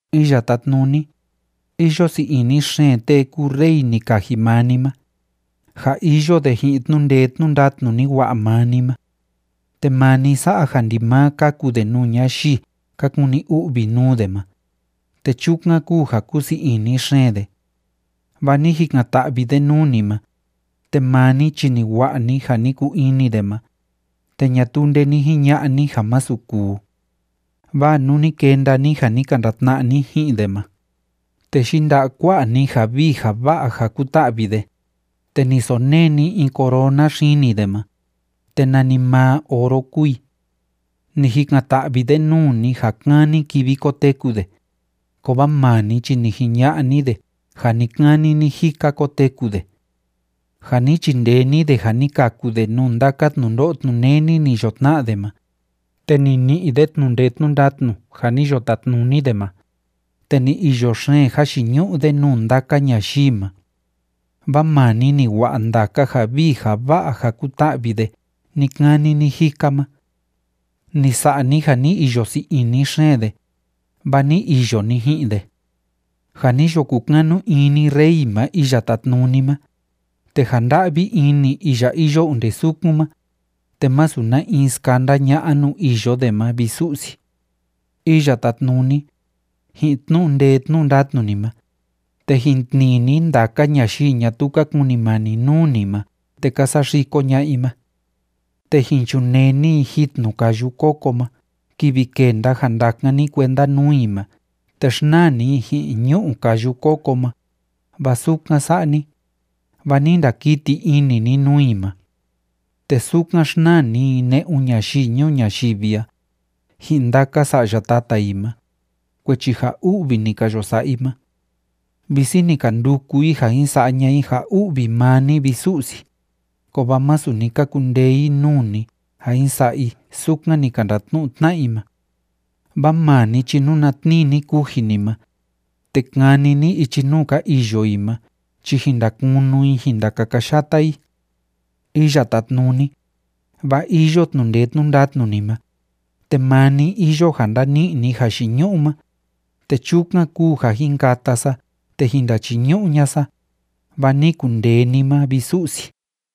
Iya Tátnuni, iyo sii ini xeen tee kúu rey ni kaji maa ni ma, ja iyo de ji'in tnu'u ndee tnu'u ndatnu ni wa'a maa ni ma. Te maa ni sa'a ja ndimaa káku de nuu ñayii ka kuni u'vi nuu de ma, te chukan kúu ja kúsii ini xeen de. Vaa ni jikan‑ta'vi de nuu ni ma, te maa ni chi ni wa'a ni ja ni kuu ini de ma, te ñatuu nde ni jiña'a ni ja másu kuu. Vaa nuu ni kenda ni ja ni ka ndatna'a ni ji'in de ma, te yinda'a kua'a ni ja vii ja va'a ja kuta'vi de, te ni sonee ni in corona xini de ma, te nanimaa oro kúu i. Ni jikan‑ta'vi de nuu ni ja kani kivi koteku de, kovaa maa ni chi ni jiña'a ni de ja ni‑kani ni‑jika koteku de. Ja ni chindee ni de ja ni kaku de nuu ndaka tnundo'o tnuneni ni yo tna'a de ma, te ni ni'i de tnu'u ndee tnu'u ndatnu ja ni yo tatnuni de ma, te ni iyo xeen jayiñu'u de nuu ndaka ñayii ma. Vaa maa ni ni wa'a ndaka ja vii ja va'a ja kuta'vi de ni‑kani ni‑jika ma. Ni sa'a ni ja ni iyo sii ini xeen de, vaa ni iyo ni ji'in de. Ja ni yo kukanu ini rey ma Iya Tátnuni ma, te ja nda'vi ini iya iyo onde sukun ma, te másu na in skanda ña'a nuu iyo de ma, vi Su'si. Iya Tátnuni, ji'in tnu'u ndee tnu'u ndatnu ni ma, te jin tnii ni ndaka ñayii ñatuu ka kunimani nuu ni ma te ka saxiko ña'a i ma. Te jin chunee ni i jitnu káyu kóko ma kivi kenda ja ndakan ni kuenda nuu i ma te xnaa ni i ji'in ñu'u káyu kóko ma, vaa sukan sa'a ni, vaa ni ndakiti ini ni nuu i ma. Te sukan xnaa ni i ne'un ñayii ñuu ñayivi a, ji'in ndaka sa'ya tata i ma, kuechi ja u'vi ni ka yo sa'a i ma. Visi ni ka nduku i ja jin sa'a ña'a i ja u'vi maa ni, vi Su'si, kovaa masu ni ka kundee i nuu ni ja jin sa'a i sukan ni ka ndatnu'u tna'a i ma. Vaa maa ni chi nuna tnii ni kuji ni ma, te kani ni ichi nuu ka iyo i ma chi jin ndakunu i jin ndakakayata i. Iya Tátnuni, vaa iyo tnu'u ndee tnu'u ndatnu ni ma, te maa ni iyo ja ndani'i ni jayiñu'u ma, te chukan kúu ja jin kata sa te jin ndachiñu'u ña'a sa, vaa ni kundee ni ma, vi Su'si.